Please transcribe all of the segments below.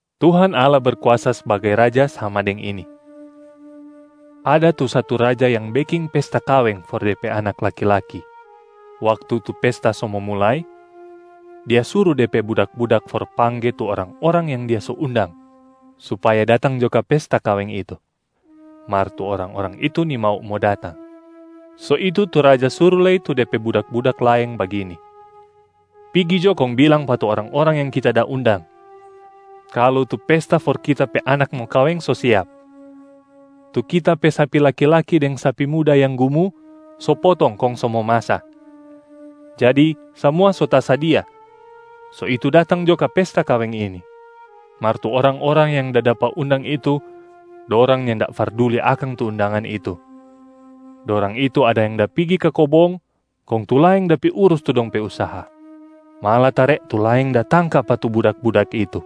“Tuhan Allah Berkuasa sbagai Raja sama deng ini: ada tu satu raja yang beking pesta kaweng for de pe anak laki-laki. Waktu tu pesta so mo mulai, Dia suru de pe budak-budak for pangge tu orang-orang yang dia so undang supaya datang jo ka pesta kaweng itu. Mar tu orang-orang itu nimau mo datang. So itu tu raja suru lei tu de pe budak-budak laeng bagini, ‘Pigi jo kong bilang pa tu orang-orang yang kita da undang, kalu tu pesta for kita pe anak mo kaweng so siap. Tu kita pe sapi laki-laki deng sapi muda yang gumu so potong kong so momasa. Jadi samua so tasadia, so itu datang jo ka pesta kaweng ini.’ Mar tu orang-orang yang da dapa undang itu, dorang nyanda farduli akang tu undangan itu. Dorang itu ada yang da pigi ka kobong, kong tu laeng da pi urus tu dong pe usaha. Malatare tu laeng da tangka pa tu budak-budak itu,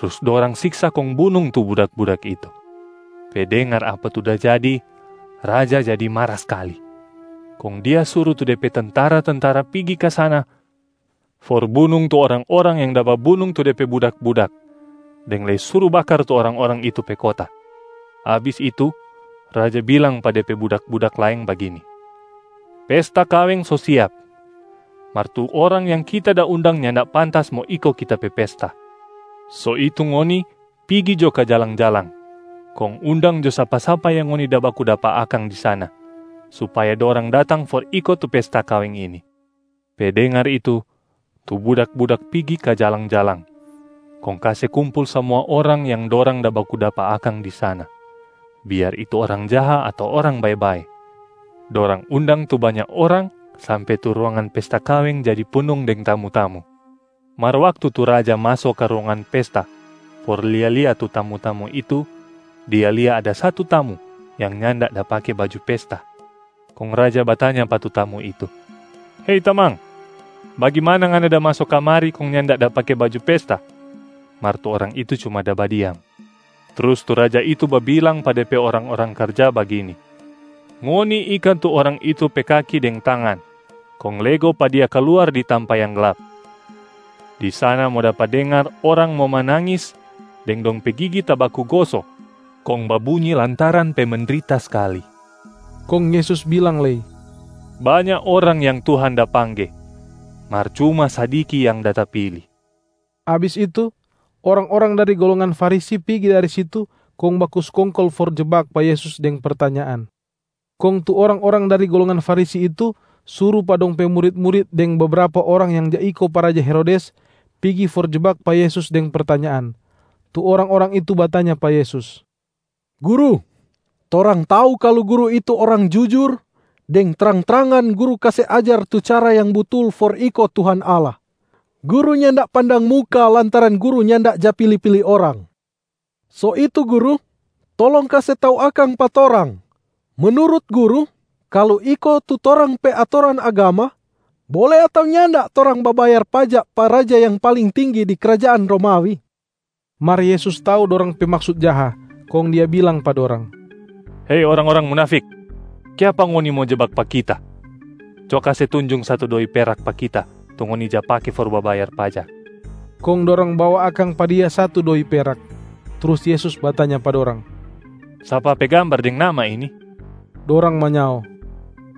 trus dorang siksa kong bunung tu budak-budak itu. Pe dengar apa tu da jadi, raja jadi mara skali. Kong dia suru tu de pe tentara-tentara pigi ka sana for bunung tu orang-orang yang da babunung tu de pe budak-budak, deng lei suru bakar tu orang-orang itu pe kota. Abis itu, raja bilang pa dia pe budak-budak laeng bagini, ‘Pesta kaweng so siap, mar tu orang yang kita da undang nyanda pantas mo iko kita pe pesta. So itu ngoni pigi jo ka jalang-jalang, kong undang jo sapa-sapa yang ngoni da baku dapa akang di sana supaya dorang datang for iko tu pesta kaweng ini.’ Pe dengar itu, tu budak-budak pigi ka jalang-jalang kong kase kumpul samua orang yang dorang da baku dapa akang di sana, biar itu orang jaha ato orang bae-bae. Dorang undang tu banya orang sampe tu ruangan pesta kaweng jadi punung deng tamu-tamu. Mar waktu tu raja maso ka ruangan pesta for lia-lia tu tamu-tamu itu, dia lia ada satu tamu yang nyanda da pake baju pesta. Kong raja batanya pa tu tamu itu, ‘Hei tamang, bagimana ngana da maso kamari kong nyanda da pake baju pesta?’ Mar tu orang itu cuma da badiam. Trus tu raja itu babilang pa de pe orang-orang karja bagini, ‘Ngoni ika tu orang itu pe kaki deng tangan kong lego pa dia kaluar di tampa yang glap.a Di sana mo dapa dengar orang mo manangis deng dong pe gigi tabaku goso kong babunyi lantaran pe mendrita skali.’” Kong Yesus bilang lei, “Banya orang yang Tuhan da pangge, mar cuma sadiki yang da tapili.” Abis itu, orang-orang dari golongan Farisi pigi dari situ kong baku skongkol for jebak pa Yesus deng pertanyaan. Kong tu orang-orang dari golongan Farisi itu suru pa dong pe murit-murit deng bebrapa orang yang ja iko pa raja Herodes pigi for jebak pa Yesus deng pertanyaan. Tu orang-orang itu batanya pa Yesus, “Guru, torang tau kalu Guru itu orang jujur, deng trang-trangan Guru kase ajar tu cara yang butul for iko Tuhan Allah. Guru nyanda pandang muka lantaran Guru nyanda ja pili-pili orang. So itu Guru, tolong kase tau akang pa torang, menurut Guru kalu iko tu torang pe atoran agama, bole ato nyanda torang babayar pajak pa raja yang paling tinggi di krajaan Romawi?” Mar Yesus tau dorang pe maksut jaha, kong Dia bilang pa dorang, “Hei orang-orang munafik, kiapa ngoni mo jebak pa Kita? Co kase tunjung satu doi perak pa Kita tu ngoni ja pake for babayar pajak!” Kong dorang bawa akang pa Dia satu doi perak. Trus Yesus batanya pa dorang, “Sapa pe gambar deng nama ini?” Dorang manyao,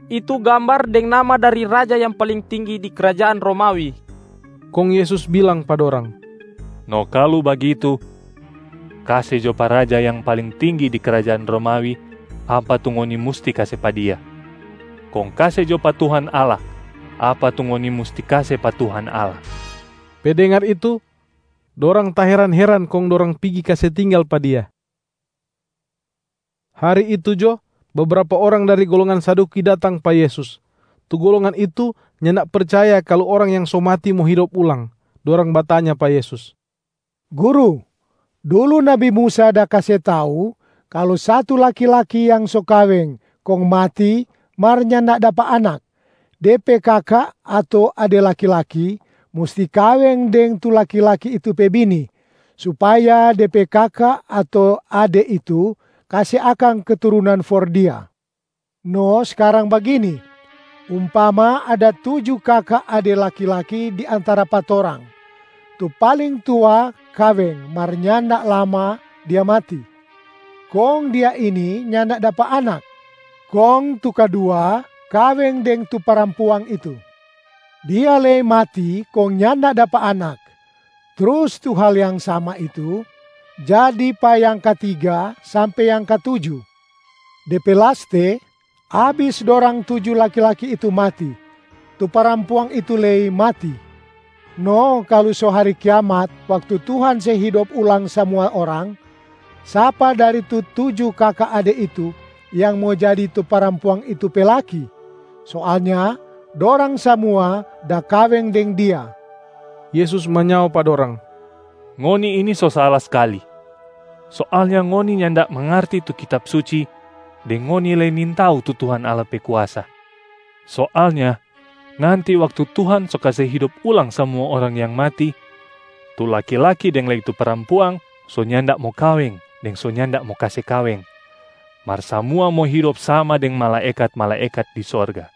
“Itu gambar deng nama dari raja yang paling tinggi di krajaan Romawi.” Kong Yesus bilang pa dorang, “No kalu bagitu, kase jo pa raja yang paling tinggi di krajaan Romawi apa tu ngoni musti kase pa dia, kong kase jo pa Tuhan Allah apa tu ngoni musti kase pa Tuhan Allah.” Pe dengar itu, dorang taheran-heran kong dorang pigi kase tinggal pa Dia. Hari itu jo, bebrapa orang dari golongan Saduki datang pa Yesus. Tu golongan itu nyanda percaya kalu orang yang so mati mo hidop ulang. Dorang batanya pa Yesus, “Guru, dulu nabi Musa da kase tau kalu satu laki-laki yang so kaweng kong mati mar nyanda dapa anak, de pe kaka ato ade laki-laki musti kaweng deng tu laki-laki itu pe bini, supaya de pe kaka ato ade itu kase akang keturunan for dia. No skarang bagini, umpama ada tuju kaka ade laki-laki di antara pa torang. Tu paling tua kaweng mar nyanda lama dia mati, kong dia ini nyanda dapa anak. Kong tu kadua kaweng deng tu parampuang itu. Dia lei mati kong nyanda dapa anak. Trus tu hal yang sama itu jadi pa yang katiga sampe yang katuju. De pe laste, abis dorang tuju laki-laki itu mati, tu parampuang itu lei mati. No kalu so hari kiamat waktu Tuhan se hidop ulang samua orang, sapa dari tu tuju kaka ade itu yang mo jadi tu parampuang itu pe laki? Soalnya dorang samua da kaweng deng dia!” Yesus manyao pa dorang, “Ngoni ini so sala skali. Soalnya ngoni nyanda mangarti tu Kitab Suci deng ngoni lei nintau tu Tuhan Allah pe kuasa. Soalnya nanti waktu Tuhan so kase hidop ulang samua orang yang mati, tu laki-laki deng lei tu parampuang so nyanda mo kaweng deng so nyanda mo kase kaweng, mar samua mo hidop sama deng malaekat-malaekat di sorga.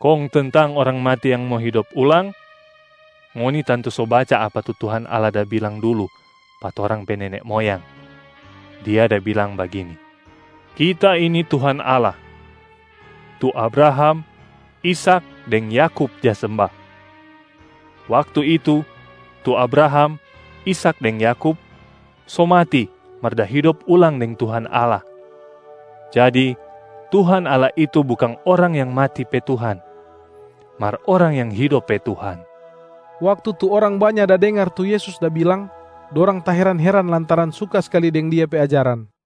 Kong tentang orang mati yang mo hidop ulang, ngoni tantu so baca apa tu Tuhan Allah da bilang dulu pa torang pe nene moyang, Dia da bilang bagini, ‘Kita ini Tuhan Allah, tu Abraham, Ishak deng Yakub ja semba.’ Waktu itu, tu Abraham, Ishak deng Yakub so mati mar da hidop ulang deng Tuhan Allah. Jadi Tuhan Allah itu bukang orang yang mati pe Tuhan, mar orang yang hidop pe Tuhan.” Waktu tu orang banya da dengar tu Yesus da bilang, dorang taheran-heran lantaran suka skali deng Dia pe ajaran.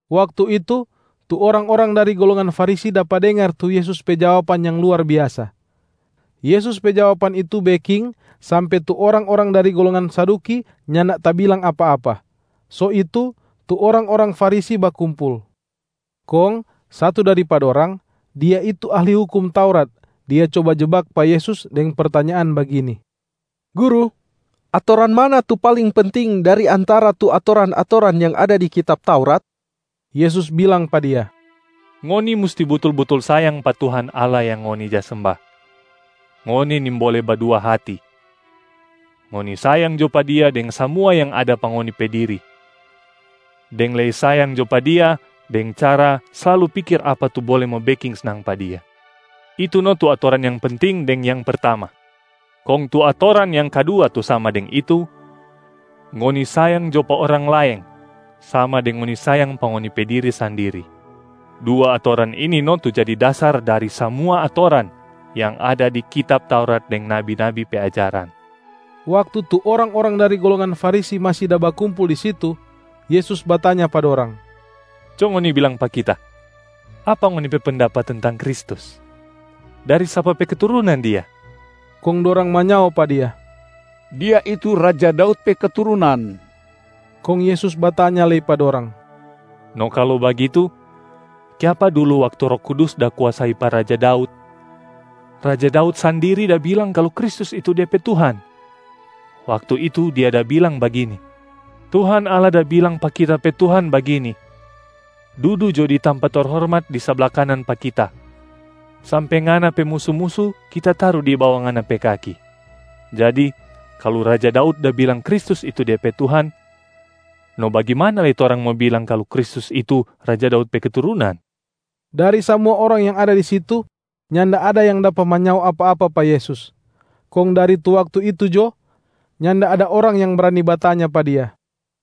Waktu itu, tu orang-orang dari golongan Farisi dapa dengar tu Yesus pe jawaban yang luar biasa. Yesus pe jawaban itu beking sampe tu orang-orang dari golongan Saduki nyanda tabilang apa-apa. So itu, tu orang-orang Farisi bakumpul, kong satu dari pa dorang, dia itu ahli hukum Taurat, dia coba jebak pa Yesus deng pertanyaan bagini, “Guru, atoran mana tu paling penting dari antara tu atoran-atoran yang ada di kitab Taurat?” Yesus bilang pa dia, “Ngoni musti butul-butul sayang pa Tuhan Allah yang ngoni ja semba, ngoni nimbole badua hati. Ngoni sayang jo pa Dia deng samua yang ada pa ngoni pe diri, deng lei sayang jo pa Dia deng cara slalu pikir apa tu bole mo beking snang pa Dia. Itu no tu atoran yang penting deng yang pertama. Kong tu atoran yang kadua tu sama deng itu, ‘Ngoni sayang jo pa orang laeng sama deng ngoni sayang pa ngoni pe diri sandiri.’ Dua atoran ini no tu jadi dasar dari samua atoran yang ada di kitab Taurat deng nabi-nabi pe ajaran.” Waktu tu orang-orang dari golongan Farisi masi da bakumpul di situ, Yesus batanya pa dorang, “Co ngoni bilang pa Kita, apa ngoni pe pendapat tentang Kristus? Dari sapa pe keturunan Dia?” Kong dorang manyao pa Dia, “Dia itu raja Daud pe keturunan.” Kong Yesus batanya lei pa dorang, “No kalu bagitu, kiapa dulu waktu Roh Kudus da kuasai pa raja Daud, raja Daud sandiri da bilang kalu Kristus itu dia pe Tuhan? Waktu itu, dia da bilang bagini, ‘Tuhan Allah da bilang pa kita pe Tuhan bagini, “Dudu jo di tampa terhormat di sabla kanan pa Kita, sampe Ngana pe musu-musu Kita taru di bawa Ngana pe kaki.” ’ Jadi kalu raja Daud da bilang Kristus itu dia pe Tuhan, no bagimana lei torang mo bilang kalu Kristus itu raja Daud pe keturunan?” Dari samua orang yang ada di situ, nyanda ada yang dapa manyao apa-apa pa Yesus. Kong dari tu waktu itu jo, nyanda ada orang yang brani batanya pa Dia.